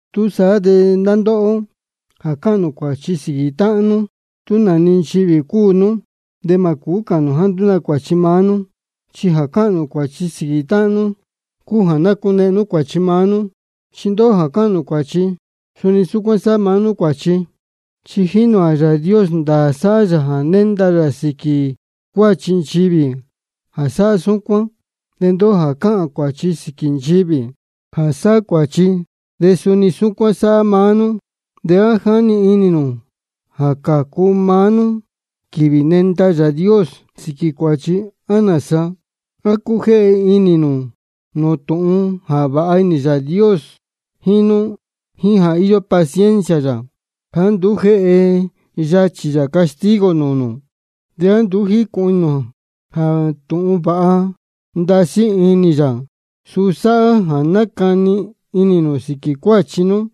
Túsaá de ndá ndóhó jā cáhān cuāchi sīquī táhán, tú nā-ni nchivī cúu nú, de mā cūú cāhān nū jāá nduú nā cuāchi maá nú. Chi jā cáhān nū cuāchi sīquī táhán nú cúu jā nácunehen nú cuāchi maá nú. Chi ndóhó jā cáhān cuāchi, suni súcuán sáhá maá nú cuāchi. Chi jínī ō jā Yāā Dios, ndāā sáhá yā jā nénda yā sīquī cuāchi nchivī jā sáhá súcuán. De ndóhó jā cáhān cuāchi sīquī nchivī jā sáhá cuāchi, de suni saá-ni sáhá maá nú, ¿de á jáni inī nū jā cācu maá nú quīvī nenda Yāā Dios sīquī cuāchi, á nāsa? ¿A cújéhe inī nū nūū tūhun jā vāha ndasí inī Yāā Dios jíín nú, jíín jā íyó paciencia yā jāá nduú jéhe yachī yā castigo nūū nū? ¿De á nduú jícūhun inī nū jā tūhun jā vāha ndasí inī yā, suu sáhá jā nacani inī nū sīquī cuáchi nú?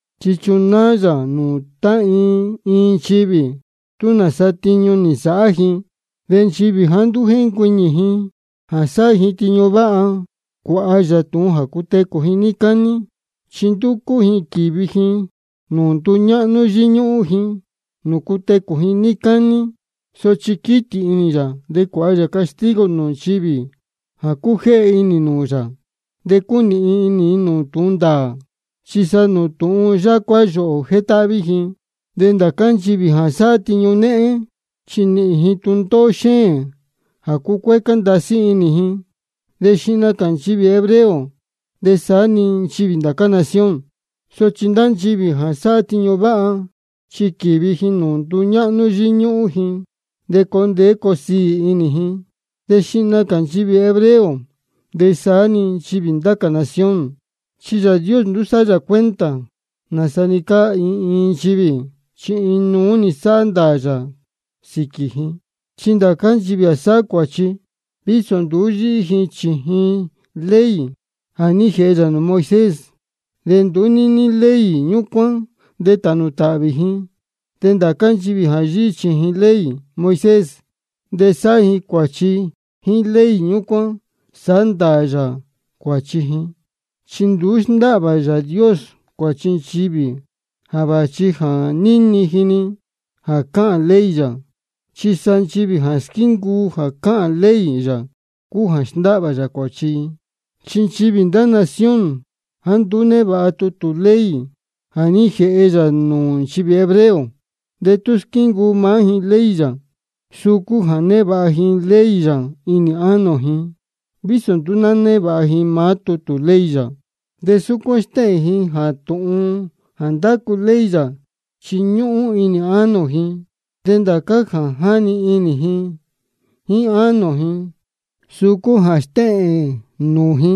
Chi nachunáá yā nūū tá iin iin nchivī tú nāsa tiñu nī nsāhá ji. De nchivī jāá nduú jéncuiñī ji jā sáhá ji tiñu váha, cuāha yā tūhun jā cutecū ji níí cání. Chi ndúcú ji quīvi ji nūū nduñáhnú yíñúhún ji, nūū cutecū ji níí cání. Sochi quītī inī yā de cuāha yā castigo nūū nchivī jā cújéhe inī nūū yā, de cúnīhin inī nūū tūhun ndāā, chi sa nūū tūhun yácuá yōhō jétáhví ji. De ndācá nchivī jā sáhá tiñu néhén, chi nīhīn ji tūndóhó xéēn de cucuécá ndasí inī ji, de xihna cā nchivī hebreo de saá-ni nchivī ndá cā nación. Sochi ndá nchivī jā sáhá tiñu váha, chi quīvi ji nūū nduñáhnú yíñúhún ji, de coo ndeé coo siī inī ji, de xihna cā nchivī hebreo de saá-ni nchivī ndá cā nación. Chi Yāā Dios nduú sáhá yā cuenta nāsa-ni cáá iin iin nchivī, chi inuú-ni sáhá ndāā yā sīquī ji. Chi ndācá nchivī jā sáhá cuāchi, vísō nduú yíhí ji chījin ley jā ní jēhe yā nūū Moisés, de nduú níní ley ñúcuán de tānū tāhvī ji. De ndācá nchivī jā yíhí chījin ley Moisés, de sáhá cuāchi, jíín ley ñúcuán sāhá ndāā yā cuāchi ji. Chi nduú sndáhvā Yāā Dios cuāchi nchivī jā vāchi jā níni ji-ni jā cáhān ley yā. Chi sa nchivī jā squíncuu jā cáhān ley yā cúu jā sndáhvā yā cuāchi ji. Chi nchivī ndá nación jāá nduú névāha tutū ley jā ní jēhe yā nūū nchivī hebreo, de tú squíncuu maá ji ley yā, suu cúu jā névāha ji ley yā inī ánō ji, vísō nduú névāha ji maá tutū ley yā. De súcuán stéhēn ji jā tūhun jā ndácu ley yā chi ñúhún inī ánō ji. De ndācá jā jáni inī ji jíín ánō ji, suu cúu jā stéhēn nūū ji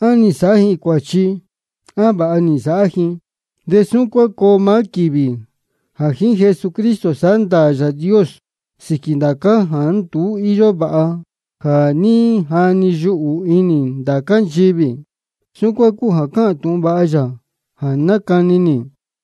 á nī nsāhá ji cuāchi á vāha nī nsāhá ji. De súcuán coo maá quīvī jā jíín Jesucristo sāhá ndāā Yāā Dios sīquī ndācá jāá nduú íyó vāha jā ní jani yuhū inī ndācá nchivī. Súcuán cúu jā cáhān tūhun vāha yā jā nácani nī.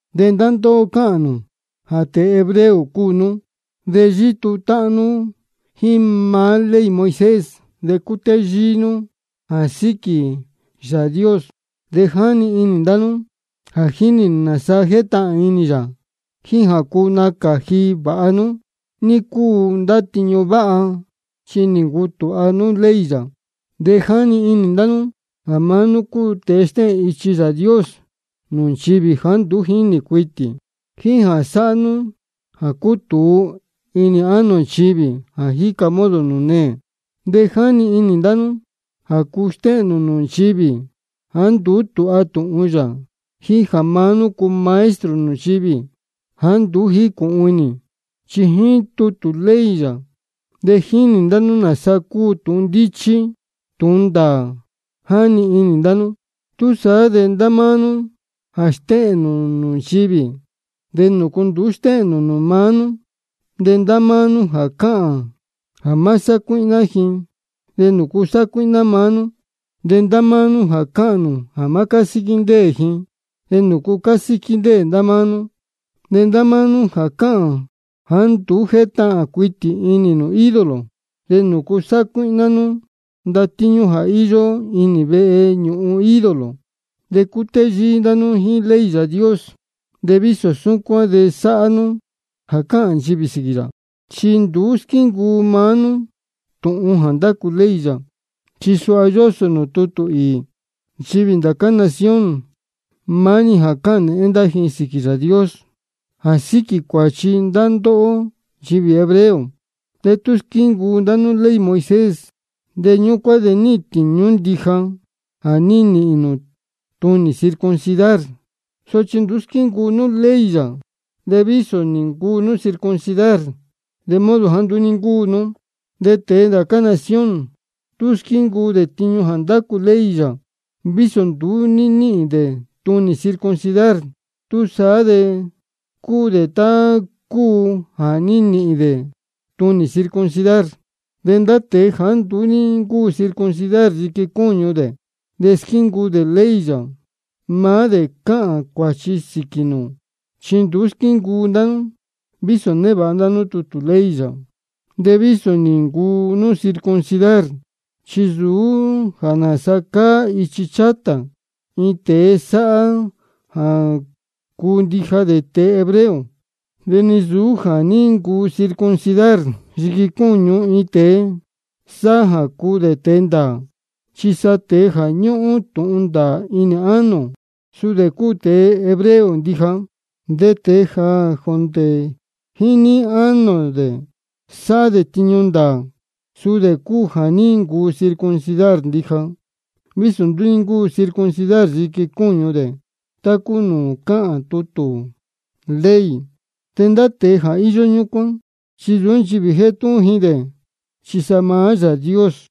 De ndá ndóhó cáhān nū jā tēe hebreo cúu nú, de yítuu táhán nú jíín maá ley Moisés, de cútéyíí nú jā síquī Yāā Dios. De jáni inī ndá nú jā jínī nū nāsa jétahān inī yā, jíín jā cuu nacāji vāha nú ní cúu ndá tiñu váha, chi nī ncutūha nú ley yā. De jáni inī ndá nú jā maá nú cúu tēe stéhēn ichi Yāā Dios nūū nchivī jāá nduú jínī cuitī, jíín jā cúu sāhá nú jā cutūu inī ánō nchivī jā jíca modo nūū neē. De jáni inī ndá nú jā cúu stéhēn nū nūū nchivī jāá nduú tūha tūhun yā, jíín jā maá nú cúu maestro nūū nchivī jāá nduú jícūhun inī. Chi jíín tutū ley yā de jínī ndá nú nāsa cúu tūhun ndíchí tūhun ndāā, jáni inī ndá nú. Túsaá de ndá máá nú jā stéhēn nūū nchivī, ¿de nūcu nduú stéhēn nū nūū maá nú? De ndá máá nú jā cáhān jā má sácuíhná ji, ¿de nūcu sácuíhná maá nú? De ndá máá nú jā cáhān jā má cásíquí ndéē ji, ¿de nūcu cásíquí ndéē maá nú? De ndá máá nú jā cáhān jāá nduú jétahān cuitī inī nū ídolo, ¿de nūcu sácuíhná nú ndatíñú jā íyó inī veñūhun ídolo? De cútéyíí ndá nú jíín ley Yāā Dios, de vísō súcuán de sáhá nú jā cáhān nchivī sīquī yā, chi nduú squíncuu maá nú tūhun jā ndácu ley yā. Chi suha yósō nūū tutū īī: Nchivī ndá cā nación, maá-ni jā cáhān nēhén ndá ji sīquī Yāā Dios jā síquī cuāchi ndá ndóhó nchivī hebreo. De tú squíncuu ndá nú ley Moisés, de ñúcuán de níhīn tīñú ndija jā ní nīhīn nū tunī circuncidar. Sochi tú nduú squíncuu nú ley yā, de vísō nī ncuu nú circuncidar, de modo jāá nduú ní ncúu nú. De tēe ndācá nación, tú squíncuu dē tiñu jā ndácu ley yā, vísō nduú ní níhīn dē tunī circuncidar, túsaá de cúu tá cúu jā ní nīhīn dē tunī circuncidar. De ndá tēe jāá nduú ní ncúu circuncidar yiqui cúñu dē, de squíncuu dē ley yā, maá dē cāhān cuāchi sīquī nū. Chi nduú squíncuu ndá nú, vísō névāha nú tutū ley yā, de vísō nī ncuu nú circuncidar. Chi nsūú jā nāsa cáá ichi chátā iin tēe sáhá jā cúu ndija dē tēe hebreo. De ni nsūú jā ní ncuu circuncidar yiqui cúñu iin tēe sáhá jā cúu dē tēe ndāā. Chi sa tēe jā ñúhún tūhun ndāā inī ánō dē, suu dē cúu tēe hebreo ndija. De tēe jā jondē jíín inī jíín ánō dē sáhá dē tiñu ndāā, suu dē cúu jā ní ncuu circuncidar ndija, vísō nduú ní ncúu circuncidar yiqui cúñu dē tá nūū cáhān tutū ley. De ndá tēe jā íyó súcuán, chi nsūú nchivī jétúhún ji dē, chi sa maá Yāā Dios.